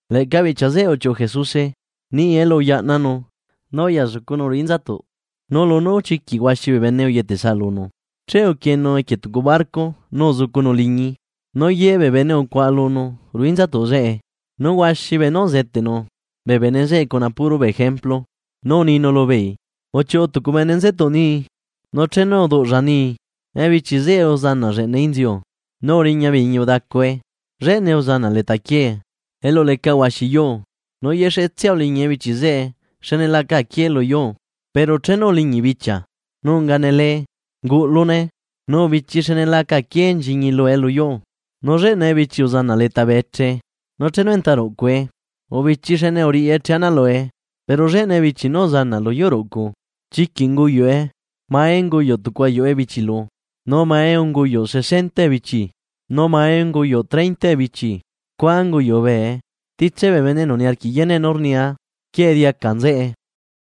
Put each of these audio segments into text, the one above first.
Leꞌca bichia zeꞌe uchiuꞌu Jesuse niꞌi elu uyaꞌnanu nu uya zucunu ruꞌu inzatuꞌ. Nu lunú chiquiꞌ huaxi bee bene uyetesaꞌ lunu, che uquienu equie tucu barco nu uzucunu liñii nu ye bee bene ucuaꞌa lunu ruꞌu inzatuꞌ zeꞌe. Nu huaxi beenú uzeteꞌnu bee bene zeꞌe cuna puro bee ejemplu. Nu uninu lubeei: ―Uchiuꞌu tucu bene nzetuꞌ nii, nu chenu rduꞌlla nii, uzanaꞌ lleꞌna ebichi zeꞌe lu inziu, nu uriña bee iñi udacue. Lleꞌnae uzanaꞌ leta quiee, elu leca huaxi yuu, nu yexetsia uliñi ebichi zeꞌe xne la aca aquié lu yuu. Pero chenu uliñi bichia, nu unga nele unguꞌlune nu ubichii xne laca aquié nchiñi lue lu yuu. Nu lleꞌna ebichi uzanaꞌ leta bee eche nu chenu enta ruꞌcue, ubichii xne uriꞌi eche ana lue. Pero lleꞌna ebichi nú uzanaꞌ lu yuu ruꞌcu, chiquiꞌ unguyuꞌe, mae unguyuꞌ tucu ayuꞌu ebichi lu, nu mae unguyuꞌ sesenta ebichi, nu mae unguyuꞌ treinta ebichi scua unguyuꞌ bee. Titse bee bene enu niarquiꞌ yeneꞌ nú rnia, ¡quieꞌe diaca nzeꞌe!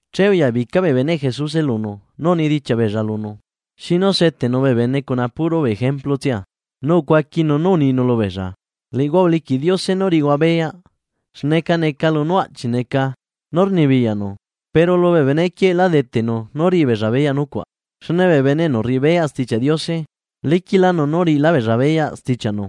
Che uyabica bee beneꞌ Jesuse lunu nu unidichiaꞌ beella lunu xinu seteꞌnu bee bene cuna puro bee ejemplu tsia. Nu ucuaquinu nú uninu lubeella: ―Liꞌihua uliquiꞌ Diose nú riꞌihua beyaꞌ xneca neca lunú aꞌchi neca nú rnibiyaꞌnu. Pero lubee benequieꞌ lá deteꞌnu nú riꞌi beella beyaꞌ nucuaꞌ. Xne bee bene enu rriꞌi beyaꞌ Stichiaꞌ Diose, liquiꞌlánu nú riꞌilá beella beyaꞌ stichiaꞌnu,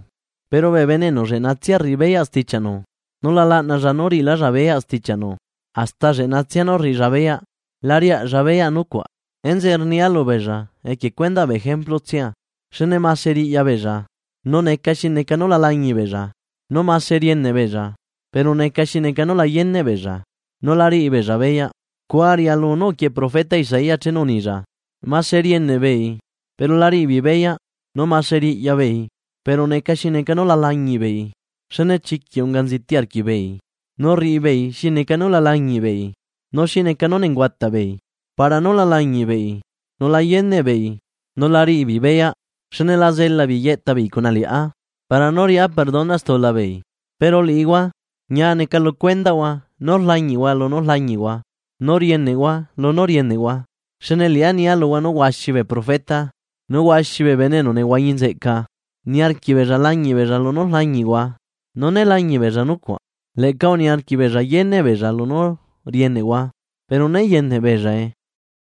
pero bee bene enu lleꞌnatsia rriꞌi beyaꞌ stichiaꞌnu, nu la laꞌnalla nú riꞌilálla beyaꞌ stichiaꞌnu hasta lu lleꞌnatsia nú rriꞌilla beyaꞌ la riaꞌlla beyaꞌ nucuaꞌ. Enzeꞌe rnia lubeella equie cuendaꞌ bee ejemplu tsia, xne mase riꞌya beella nu neca xi neca nula lañiꞌ beella nu mase rieneꞌ beella pero neca xi neca nu la yeneꞌ beella. Nu la riꞌi beella beyaꞌ. Scua rialu nú uquieꞌe profeta Isaías chenu unilla: Mase rieneꞌ beei, pero la riꞌi beei beyaꞌ. Nu mase riꞌya beei, pero neca xi neca nú la lañiꞌbeei. Xne chiquiꞌ unga nziti arquiꞌbeei, nu rriꞌi beei xi neca nú la lañiꞌbeei, nu xi neca nú nenguataꞌ beei para nú la lañiꞌbeei, nu la yeneꞌ beei nu la riꞌi beei beyaꞌ, xne la zelaꞌ beei yeꞌta beei cuna liꞌá, para nú riꞌá perdona stula beei. ’Pero liꞌihua: Ñia neca lu cuendaꞌhua nú rlañiꞌhua lunú rlañiꞌhua nu rieneꞌhua lunú rieneꞌhua. Xne liꞌá nia luhua nú huaxi bee profeta nu huaxi bee bene enu uhuañi nzeꞌca uniarquiꞌ beella lañiꞌ beella lunú rlañiꞌhua. Nu né lañiꞌ beella nucuaꞌ. Leꞌca uniarquiꞌ beella yeneꞌ beellla lunú rieneꞌhua, pero né yeneꞌ beellae.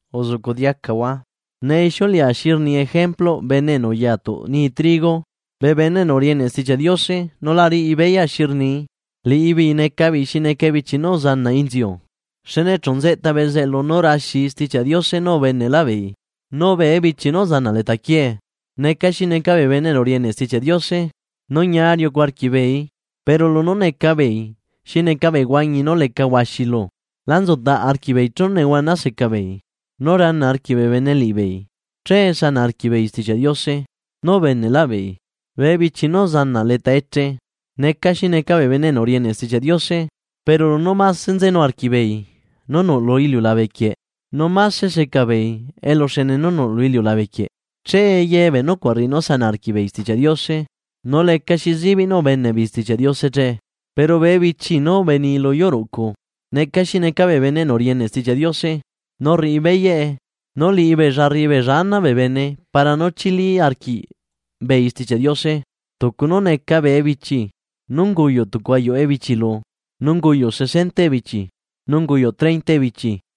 ’Uzuꞌcuꞌ diacahua ne ixiuleꞌa xi rni ejempluꞌ bene enu uya tuꞌ nii trigo. Bee bene enu rieneꞌ Stichiaꞌ Diose nu la riꞌi beyaꞌ xi rnii, liꞌibeei neca beei xi neca ebichi nú uzanaꞌ inziu, xne chu nzeꞌta bezeꞌlu nu raxii Stichiaꞌ Diose nú ubeneꞌlaꞌ beei. Nu bee ebichi nú uzanaꞌ leta quiee, neca xi neca bee bene enu rieneꞌ Stichiaꞌ Diose nu ñia riucu arquiꞌbeeii, pero lunú neca beei xi neca bee huañi nú leca huaxi luu la nzutaꞌ arquiꞌbeei chenu nehuana seca beei nu rana arquiꞌ bee bene liꞌibeei, che sanaꞌ arquiꞌ beei Stichiaꞌ Diose nú ubeneꞌlaꞌ beei. Bee ebichi nú uzanaꞌ leta eche, neca xi neca bee bene enu rieneꞌ Stichiaꞌ Diose, pero lunú máse nzenu arquiꞌbeei nú nuꞌ lu iliulabe quieꞌ nu máse seca beei eluxene nú nuꞌ lu iliulabequieꞌ, che ye bee nucuaꞌ rriꞌi nú sanaꞌ arquiꞌbeei Stichiaꞌ Diose. Nu lecaxi zibiꞌ nú ubeneꞌbeei Stichiaꞌ Diose che. Pero bee ebichi nú ubenii lu yuu ruꞌcu, neca xi neca bee bene enu rieneꞌ Stichiaꞌ Diose nu rriꞌi beyaꞌe, nu liꞌibeella rriꞌi beella ana bee bene para nú chili arquiꞌbeei Stichiaꞌ Diose, tucu nú neca bee ebichi nú unguyuꞌ tucu ayuꞌu ebichi lu, nu unguyuꞌ sesenta ebichi, nu unguyuꞌ treinta ebichi.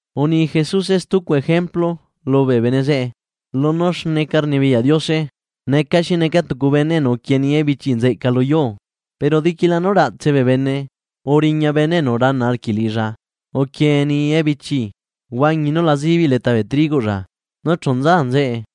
Uni Jesuse stucu ejemplu lubee bene zeꞌe: ―Lunú xneca rnibiyaꞌ Diose neca xi neca tucu bene enu uquienii ebichi nzeꞌca lu yuuꞌ; pero diquila nú raꞌtse bee bene uriña bene enu rana arquiꞌ liꞌilla uquienii ebichiꞌ huañi nu la zibiꞌ leta bee trigoꞌlla, nu chu nza nzeꞌe.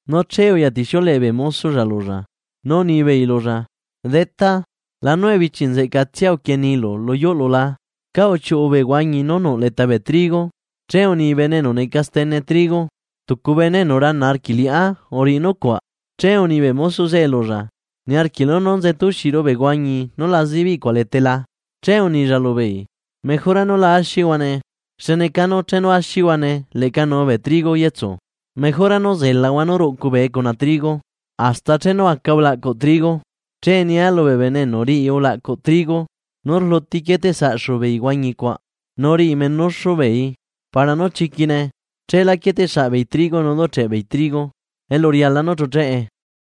Nu che uyatixiuleꞌe bee mosoꞌlla lulla, nu unibeei lulla: “Detá, lanu ebichi nzeꞌcatsia uquieniilu lu yuuꞌlu la, ¿cá uchiuꞌu bee huañi nú nuꞌ leta bee trigo?” Che uni bene enu neca stene trigo: “Tucu bene enu rana arquiꞌ liꞌá uriꞌi nucuaꞌ.” Che uni bee mosoꞌ zeꞌe lulla: “¿Niarquiꞌlu nú nzetaxiru bee huañi nu la zibiꞌ cuaꞌ letae la?” Che unilla lubeei: “Mejora nú la axihuane, xne canu chenu axihuane leꞌca nuu bee trigo yetsu. Mejora nú zelaꞌahua nú ruꞌcu bee cuna trigo hasta chenu aca ulaꞌcuꞌ trigo. Che nia lubee bene enu riꞌi ulaꞌcuꞌ trigo nú rluti quieteꞌsaꞌxu beei huañi cuaꞌ nu riꞌi menuxu beeii para nú chiquine. Cheelá quieteꞌ saꞌbeei trigo nu ducheꞌ beei trigo elu riala nú chucheꞌe.”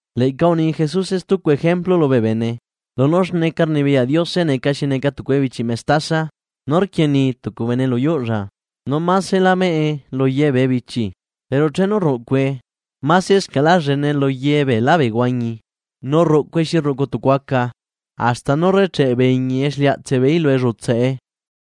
Leꞌca uni Jesuse stucu ejemplu lubee bene: ―Lunú xneca rnibiyaꞌ Diose neca xi neca tucu ebichiꞌ mestasa nú rquienii tucu bene lu yuuꞌlla. Nú masela meꞌe luye bee ebichi. Pero chenu rruꞌcue, masescaꞌla llenee luye beelá bee huañi, nu rruꞌcue xi rruꞌcu tucu aca, hasta nú rrecheꞌ bee iñi exliaꞌtseꞌ beeí lu ellutsaꞌe.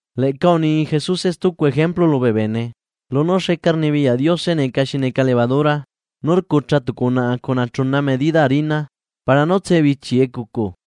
Leꞌca uni Jesuse stucu ejemplu lubee bene: ―Lunú xneca rnibiyaꞌ Diose neca xi neca levadura nú rcucha tucu unaꞌa cuna chuna medida harina para nú tsebichi ecucu.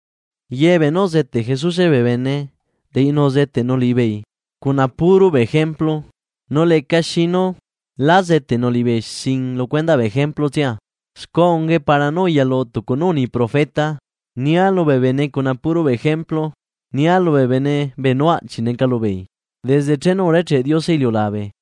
Ye beenú uzeteꞌ Jesuse bee bene, liꞌinu uzeteꞌnu liꞌibeei cuna puro bee ejemplu nu lecaxi nu lá zeteꞌnu liꞌibeei sin lu cuendaꞌ bee ejemplu tsia. Scua ungae para nú uyalu tucu nú uni profeta: Nia lubee bene cuna puro bee ejemplu. Nia lubee bene beenú aꞌchiꞌ neca lubeei desde chenu urecheꞌ Diose iliulabe.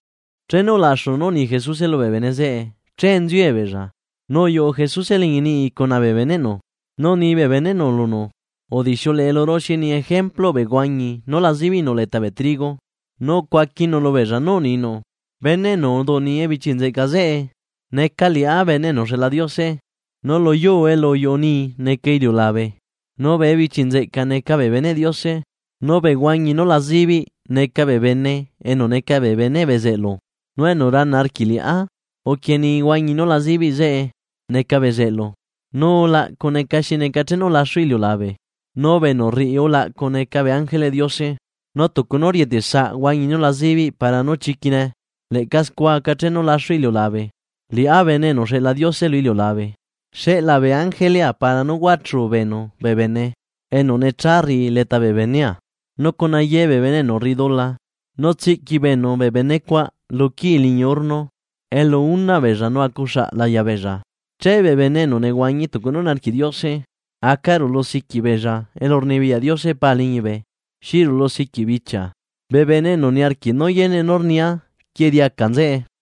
Chenu ulaxu nú uni Jesuse lubee bene zeꞌe che inziue beella nu uyuꞌu Jesuse liñi niꞌi cuna bee beneꞌnu, nu uni bee beneꞌnu lunu: ―Udixiuleꞌe luru xi rni ejempluꞌ bee huañi nú la zibiꞌ nú nuꞌ leta bee trigo. Nu ucuaquinu lubeella nú uninu: ―Bene enu uduꞌnii ebichi nzeꞌca zeꞌe, neca liꞌá Bene enu uxeꞌla Diose, nu lu yuu elu uyuꞌu nii neca iliulabe. Nu bee ebichi nzeꞌca neca bee beneꞌ Diose, nu bee huañi nu la zibiꞌ neca bee bene enu neca bee beneꞌ bezeꞌlu, nu enu rana arquiꞌ liꞌá uquienii huañi nu la zibiꞌ zeꞌe neca bezeꞌlu. Nu ulaꞌcu neca xi neca chenu laxu iliulabe, nu bee enu rriꞌi ulaꞌcu neca bee ángeleꞌ Diose. Nu tucu nú rieteꞌ saꞌ huañi nu la zibiꞌ para nú chiquine, leꞌca scua aca chenu laxu iliulabe. Liꞌá Bene enu uxeꞌla Diose lu iliulabe, xeꞌlaa bee ángelea para nú huachu beenu bee bene enu necha rriꞌi leta bee benea, nu cuna ye bee bene enu rriꞌi dula. Nu tsiꞌqui beenu bee bene cuaꞌ luquii liñi horno, elu unaꞌ beella nu acuxaꞌ laya beella. Che bee bene enu nehuañi tucu nú niarquiꞌ Diose, aca rulusiquiꞌ beella elurnibiyaꞌ Diose Pa liñibe xi rulusiquiꞌ bichia. Bee bene enu niarquiꞌ nú yeneꞌ nú rnia, quieꞌe diaca nzeꞌe.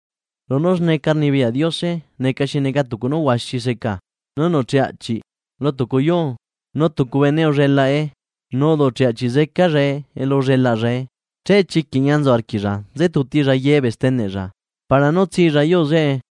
’Lunu xneca rnibiyaꞌ Diose neca xi neca tucu nú huaxi seca nú nuꞌcheꞌ aꞌchiꞌ lu tucu yuu. Nu tucu bene ullelaꞌe nu uduꞌcheꞌ aꞌchiꞌ zecallae elu ullelaꞌllae, che chiquiꞌ ñia nzu arquiꞌlla nze tutilla yebee steneꞌlla para nú tsilla yuu zeꞌe.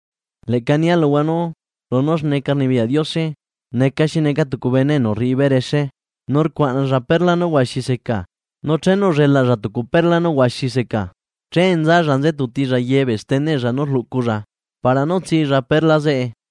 ’Leꞌca nia luhua nú lunú xneca rnibiyaꞌ Diose neca xi neca tucu bene enu rriꞌi berexe nu rcuaꞌnalla perla nú huaxi seca, nu chenu ullelaꞌlla tucu perla nú huaxi seca, che nzalla nze tutilla yebee steneꞌlla nú rluꞌculla para nú tsilla perla zeꞌe.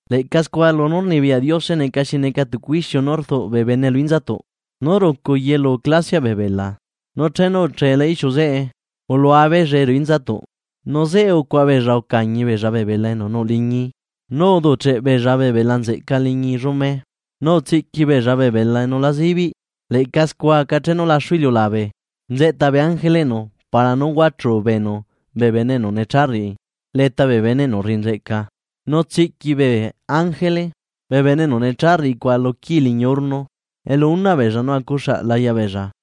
’Leꞌca scua lunú rnibiyaꞌ Diose neca xi neca tucu ixiu nú rduꞌ bee bene lu inzatuꞌ nú rucu yelu clasia bee bela. Nu chenu ucheela ixiu zeꞌe, ulua beellae ruꞌu inzatuꞌ, nu zeꞌe ucuaꞌa beella ucañi beella bee bela enu nuꞌ liñii, nu uduꞌcheꞌ beella bee bela nzeꞌca liñi llume, nu utsiꞌqui beella bee bela enu la zibiꞌ. Leꞌca scua aca chenu laxu iliulabe; nzeꞌta bee ángeleꞌnu para nú huachu beenu bee bene enu necha rriꞌi leta bee bene enu rriꞌi nzeꞌca, nu tsiꞌqui bee ángele bee bene enu necha rriꞌi cuaꞌ lu quii liñi horno, elu unaꞌ beella nu acuxaꞌ laya beella.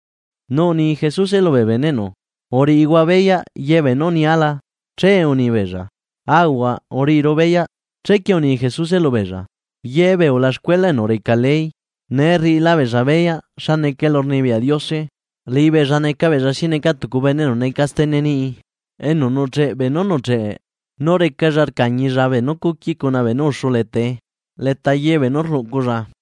Nu uni Jesuse lubee beneꞌnu: ―¿Uriꞌihua beyaꞌ yebee nú unia la? Che uni beella: ―Aahuaꞌ, uriꞌiru beyaꞌ. Chequie uni Jesuse lubeella: ―Yebee ulaxcuela enu reca ley, nee rriꞌila beella beyaꞌ xa neca elurnibiyaꞌ Diose, liꞌibeella neca beella xi neca tucu bene enu neca stene tucu niꞌi enu nucheꞌ beenú nucheꞌe nu recalla rcañilla beenú cuqui cuna beenú uxu leta ye beenú rluꞌculla.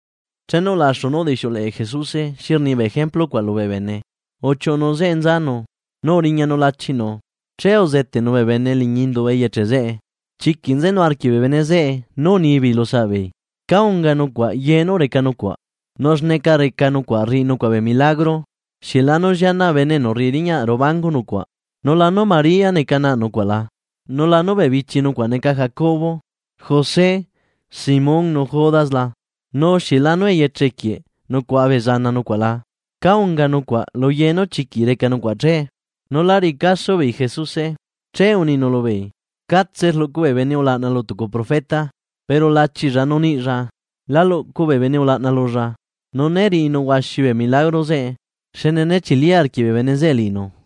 Chenu ulaxu nú udixiuleꞌe Jesuse xi rni bee ejemplu cuaꞌ lubee bene, uchiuꞌunu zeꞌe nzanu nu uriñanu lachinu. Che uzeteꞌnu bee bene liñi indu eyeche zeꞌe. Chiquiꞌ nzenu arquiꞌ bee bene zeꞌe nú unibeei lu saꞌbeei: ―¿Cá unga nucuaꞌ ye nú reca nucuaꞌ? ¿Nu xneca reca nucuaꞌ rriꞌi nucuaꞌ bee milagro? ¿Xieꞌ lanu llianaꞌ bene enu rriꞌi riñaꞌ ruꞌu bangu nucuaꞌ, nu lanu María neca naꞌ nucuaꞌ la? ¿Nu lanu bee bichi nucuaꞌ neca Jacobo, José, Simón nu Judas la? ¿Nu xieꞌ lanu eyeche quieꞌ nucuaꞌa bee zana nucuaꞌ la? ¿Cá unga nucuaꞌ lu ye nú chiquiꞌ reca nucuaꞌ che? Nu lá riꞌi caso beei Jesuse. Che uninu lubeei: ―Catse rluꞌcu bee bene ulaꞌna lu tucu profeta. Pero lachilla nu niꞌlla, la luꞌcu bee bene ulaꞌna lulla. Nu né riꞌinu huaxi bee milagro zeꞌe xne né chili arquiꞌ bee bene zeꞌe liꞌinu.